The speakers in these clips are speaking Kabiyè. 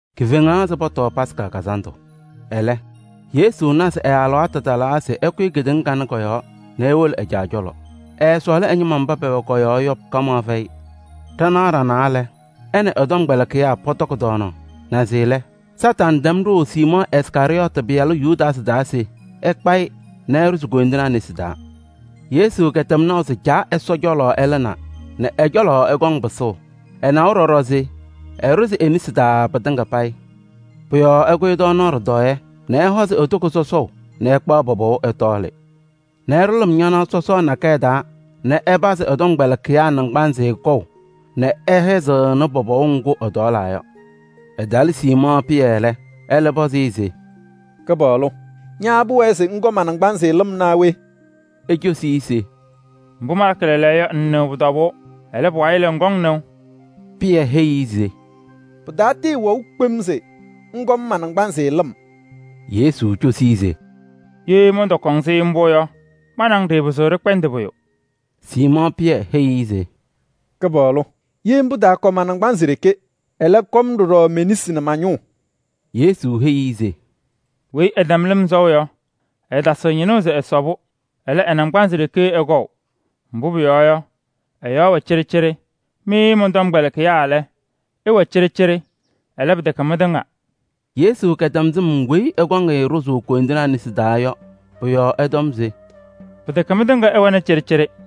Kifeŋaɣ se pɔtɔɔ Yomiye Taa Lɩʋ Kazandʋ. Ɛlɛ Yesu na se ɛ-alɩwaatʋ talaa se ɛkʋyɩ kedeŋa kanɛ kɔ-yɔɔ nɛ ewolo ɛ-Caa cɔlɔ. Ɛɛsɔɔlɩ ɛ-ñɩma mba pɛwɛ kɔ-yɔɔ yɔ kamaɣ fɛyɩ. Ɖanaɣ ɖanaa lɛ, ɛ nɛ ɛ-tɔmkpɛlɩkɩyaa pɔtɔkɩ tɔɔnaɣ. Naze lɛ, Kañadʋ Satanɩ tɛm ɖʋʋ Siimɔɔ Iskarɩyɔɔtɩ pɩyalʋ Yudaasɩ taa se ɛkpa-ɩ nɛ ɛɖʋzɩ koyindinaa nesi taa. Yesu kɛtɛm naʋ se Caa Ɛsɔ cɔlɔ ɛlɩnaa nɛ ɛ-cɔlɔ ɛkɔŋ pɩsʋʋ. Ɛnawa ɖɔɖɔ se ɛɖʋzɩ e-nesi taa pɩtɩŋa payɩ. Pʋ-yɔɔ ɛkʋyɩ tɔɔnaɣ ɖɩtɔɔyɛ nɛ ɛhɔzɩ e-toko sɔsɔʋ nɛ ɛkpaɣ pɔpɔʋ ɛtɔɔlɩ nɛ ɛɖʋ lɩm ñanaɣ sɔsɔɔ nakɛyɛ taa nɛ ɛpazɩ ɛ-tɔmkpɛlɩkɩyaa naŋgbanzɩ kɔʋ nɛ ɛhɛzɩɣnɩ pɔpɔʋ ŋgʋ ɛtɔɔlaa yɔ. Ɛtalɩ Siimɔɔ Pɩyɛ lɛ, ɛlɛ pɔzɩ-ɩ se: “Kɩpaɣlʋ! Ña pʋwɛɛ se ŋkɔ ma-naŋgbanzɩ lɩm naa we?” Ecosi-i se: “Mbʋ malakɩ lɛɛlɛɛyɔ yɔ, ŋŋnɩɣ pʋ-tɔbʋʋ. Ɛlɛ, pʋwayɩ lɛ, ŋkɔŋ nɩʋ.” Pɩyɛ heyi-i se: “Pɩtatɩɩwɛʋ kpem se ŋkɔ-m ma-naŋgbanzɩ lɩm!” Yesu cosi-i se: “Ye mɔntɔkɔ-ŋ-sɩ mbʋ yɔ, ma nɛ ŋ ɖɩɩpɩzɩɣ ɖɩkpɛndɩ pʋyʋ.” Siimɔɔ Pɩyɛ heyi-i se: “Kɩpaɣlʋ! Ye mbʋ, taakɔ ma-naŋgbanzɩ ɖeke. Ɛlɛ, kɔ-m ɖɔɖɔ me-nesi nɛ ma-ñʋʋ!” Yesu heyi-i se: “Weyi ɛtɛm lɩm sɔʋ yɔ, ɛɛtasɩɣ ñɩnʋʋ se ɛsɔ-pʋ. Ɛlɛ, ɛ-naŋgbanzɩ ɖeke ɛkɔʋ, mbʋ pʋyɔɔ yɔ, ɛ-yɔɔ wɛ cɩɖɩcɩɖɩ. Mɩ mɔn-tɔmkpɛlɩkɩyaa lɛ, ɩwɛ cɩɖɩcɩɖɩ, ɛlɛ, pɩtɛkɛ mɩtɩŋa.” Yesu kɛtɛm sɩm weyi ɛkɔŋ-ɩ ɖʋzʋʋ koyindinaa nesi taa yɔ, pʋ-yɔɔ ɛtɔm se: “Pɩtɛkɛ mɩtɩŋa ɩwɛnɩ cɩɖɩcɩɖɩ.”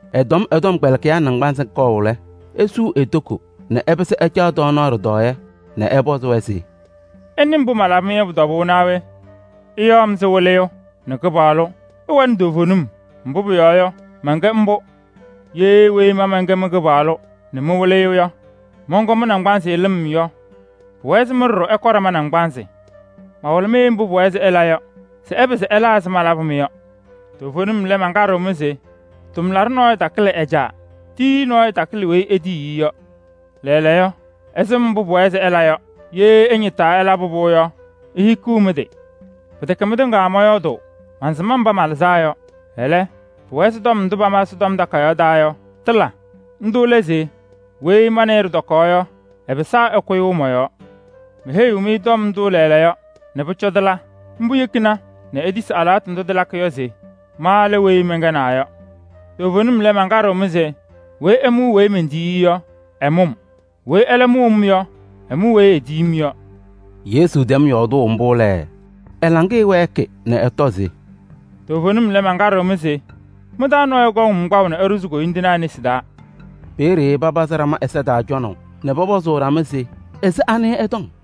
Ɛtɛm ɛ-tɔmkpɛlɩkɩyaa naŋgbanzɩ kɔʋ lɛ, esuu e-toko nɛ ɛpɩsɩ ɛcaɣ tɔɔnaɣ ɖɩtɔɔyɛ nɛ ɛpɔzɩ-wɛ se: “Ɩnɩ mbʋ malabɩ-mɩ yɔ pʋ-tɔbʋʋ naa we? Ɩyaɣ-m se: ‘Wɩlɩyʋ’ nɛ ‘Kɩpaɣlʋ.’ Ɩwɛnɩ toovenim, mbʋ pʋyɔɔ yɔ, mɛnkɛ mbʋ. Ye weyi ma mɛnkɛ mɩ-Kɩpaɣlʋ nɛ mɩ-Wɩlɩyʋ yɔ, mɔnkɔ mɩ-naŋgbanzɩ lɩm yɔ, pʋwɛɛ se mɩ ɖɔɖɔ, ɩkɔ ɖama naŋgbanzɩ. Mawɩlɩ-mɩ mbʋ pʋwɛɛ se ɩla yɔ se ɩpɩzɩ ɩla ɛzɩ malabʋ-mɩ yɔ. Toovenim lɛ, mankaɖɩɣ-mɩ se: tʋmlaɖʋ nɔɔyʋ takɩlɩ ɛ-caa, tiyiyu nɔɔyʋ takɩlɩ weyi etiyi-i yɔ. Lɛɛlɛɛyɔ, ɩsɩm mbʋ pʋwɛɛ se ɩla yɔ. Ye ɩñɩtaa ɩlabɩ-pʋ yɔ, ihikiɣ mɩ-tɩ! Pɩtɛkɛ mɩtɩŋa mɔyɔɔdʋʋ, mansɩm mba malɩzaa yɔ. Ɛlɛ, pʋwɛɛ se tɔm ndʋ pama Ɛsɔtɔm Takayaɣ taa yɔ, tɩla. Ndʋ lɛ se: ‘Weyi ma nɛ ɩ ɖɩtɔkaɣ yɔ, ɛpɩsaa ɛkʋyʋʋ mɔ-yɔɔ.’ Meheyiɣ-mɩ tɔm ndʋ lɛɛlɛɛyɔ se pʋcɔ tɩla. Mbʋ yekina nɛ itisi alɩwaatʋ ndʋ tɩlakɩ yɔ se: ‘Ma lɛ weyi mɛnkɛnaa yɔ.’ Toovenim lɛ, mankaɖɩɣ-mɩ se: weyi ɛmʋʋ weyi mentiyi-i yɔ, ɛmʋʋ-m. Weyi ɛlɛ mʋʋ-m yɔ, ɛmʋʋ weyi etiyi-m yɔ.” Yesu tɛm yɔɔdʋʋ mbʋ lɛ, ɛ-laŋɩyɛ wɛɛkɩ nɛ ɛtɔ se: “Toovenim lɛ, mankaɖɩɣ-mɩ se: mɩ-taa nɔɔyʋ kɔŋ-m kpaʋ nɛ ɛɖʋzɩ koyindinaa nesi taa.” Peeye papazɩ ɖama ɛza taa cɔnaʋ nɛ pɔpɔzʋʋ ɖama se: “Ɛzɩ anɩ ɛtɔŋ?”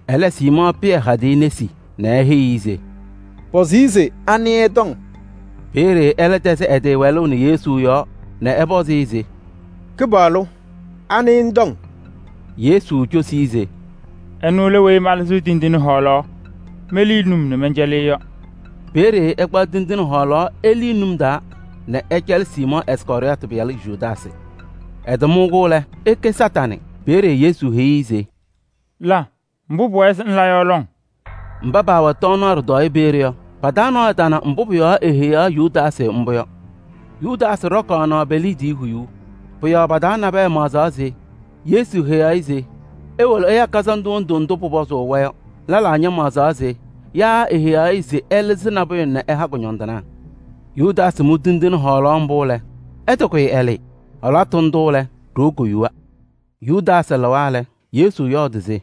Ɛlɛ Siimɔɔ Pɩyɛ hadɩ-ɩ nɛ eheyi-i se: “Pɔzɩ-ɩ se anɩ ɛtɔŋ?” Peeye ɛlɛ tɛzɩ ɛ-tɩ wɛlʋʋ nɛ Yesu yɔɔ nɛ ɛpɔzɩ-ɩ se: “Kɩpaɣlʋ! Anɩ ŋtɔŋ?” Yesu cosi-i se: “Ɛnʋ lɛ weyi malɩzɩɣ tindine hɔɔlaɣ melii num nɛ mɛncɛlɩ-ɩ yɔ.” Peeye ɛkpaɣ tindine hɔɔlaɣ elii num nɛ ɛcɛlɩ Siimɔɔ Iskarɩyɔɔtɩ pɩyalʋ Yudaasɩ. Ɛtɩmʋ-kɛ lɛ, eke Kañadʋ Satanɩ. Peeye Yesu heyi-i se: “La mbʋ pʋwɛɛ se ŋla yɔ lɔŋ!” Mba paawɛ tɔɔnaɣ ɖɩtɔɔyɛ peeye yɔ, pa-taa nɔɔyʋ tana mbʋ pʋ-yɔɔ eheyaɣ Yudaasɩ mbʋ yɔ. Yudaasɩ ɖɔkaɣnɩ pe-liidiye huyuu. Pʋ-yɔɔ pa-taa nabɛyɛ maɣzaɣ se Yesu heyaɣ-ɩ se ewolo ɛya kazandʋ wondu ndʋ pʋpɔzʋʋ-wɛ yɔ. Lɛlaa ñamaɣzɩɣ se yaa eheyaɣ-ɩ se ɛlɩzɩ nabʋyʋ nɛ ɛha kʋñɔndɩnaa. Yudaasɩ mʋ tindine hɔɔlaɣ mbʋ lɛ, ɛtɩkʋyɩ ɛlɩɩ. Alɩwaatʋ ndʋ lɛ, ɖoo koyuwa. Yudaasɩ lɩwa lɛ, Yesu yɔɔdɩ se: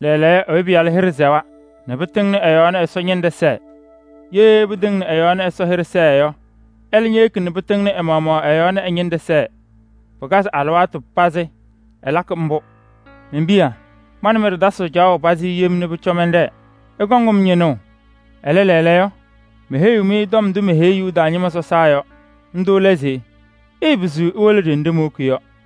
“Lɛɛlɛɛyɔ Ɛyʋ Pɩyalʋ hɩɖɛ sɛwa nɛ pɩtɩŋnɩ ɛ-yɔɔ nɛ Ɛsɔ ñɩnɖɛ sɛɛ. Ye pɩtɩŋnɩ ɛ-yɔɔ nɛ Ɛsɔ hɩɖɛ sɛɛ yɔ, ɛlɛ ñeyeki nɛ pɩtɩŋnɩ ɛ-maɣmaɣ ɛ-yɔɔ nɛ ɛnʋ ñɩnɖɛ ñɛsɛɛ. Ɛlakɩ-pʋ alɩwaatʋ pazɩ taa. Men-piya! Ma nɛ mɩ ɖɩtasɩɣ caɣʋ pazɩ yem nɛ pʋcɔ mɛnɖɛɛ. Ɩkɔŋ-m ñɩnʋʋ, ɛlɛ, lɛɛlɛɛyɔ meheyiɣ-mɩ tɔm ndʋ meheyi Yuda ñɩma sɔsaa yɔ. Ndʋ lɛ se: ɩɩpɩzɩɣ iwolo ɖenɖe mowoki yɔ.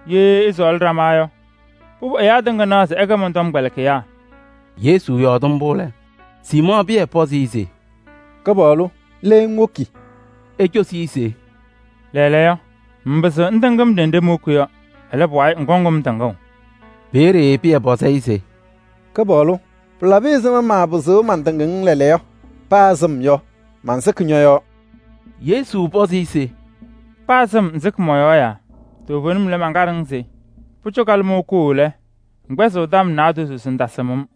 Ye ɩsɔɔlɩ ɖama yɔ, pʋbʋ ɛyaa tɩŋa naɣ se ɩkɛ mɔn-tɔmkpɛlɩkɩyaa.” Yesu yɔɔdɩ mbʋ lɛ, Siimɔɔ Pɩyɛ pɔzɩ-ɩ se: “Kɩpaɣlʋ! Le ŋwoki?” Ecosi-i se: “Lɛɛlɛɛyɔ, ŋŋpɩzɩɣ ŋtɩŋ-m ɖenɖe mowoki yɔ. Ɛlɛ, pʋwayɩ ŋkɔŋ-m tɩŋʋʋ.” Peeye Pɩyɛ pɔzɩ-ɩ se: “Kɩpaɣlʋ! Pɩlabɩ ɛzɩma nɛ maapɩzɩɣ mantɩŋ-ŋ lɛɛlɛɛyɔ? Paa sɩm yɔ, mansɩkɩ ñɔ-yɔɔ!” Yesu pɔzɩ-ɩ se: “Paa sɩm, ŋsɩkɩ mɔ-yɔɔ yaa? Toovenim lɛ, mankaɖɩɣ-ŋ se: pʋcɔ kalɩmɔʋ koo lɛ, ŋkpɛzɩɣ tɔm naadozo se ŋtasɩm-m.”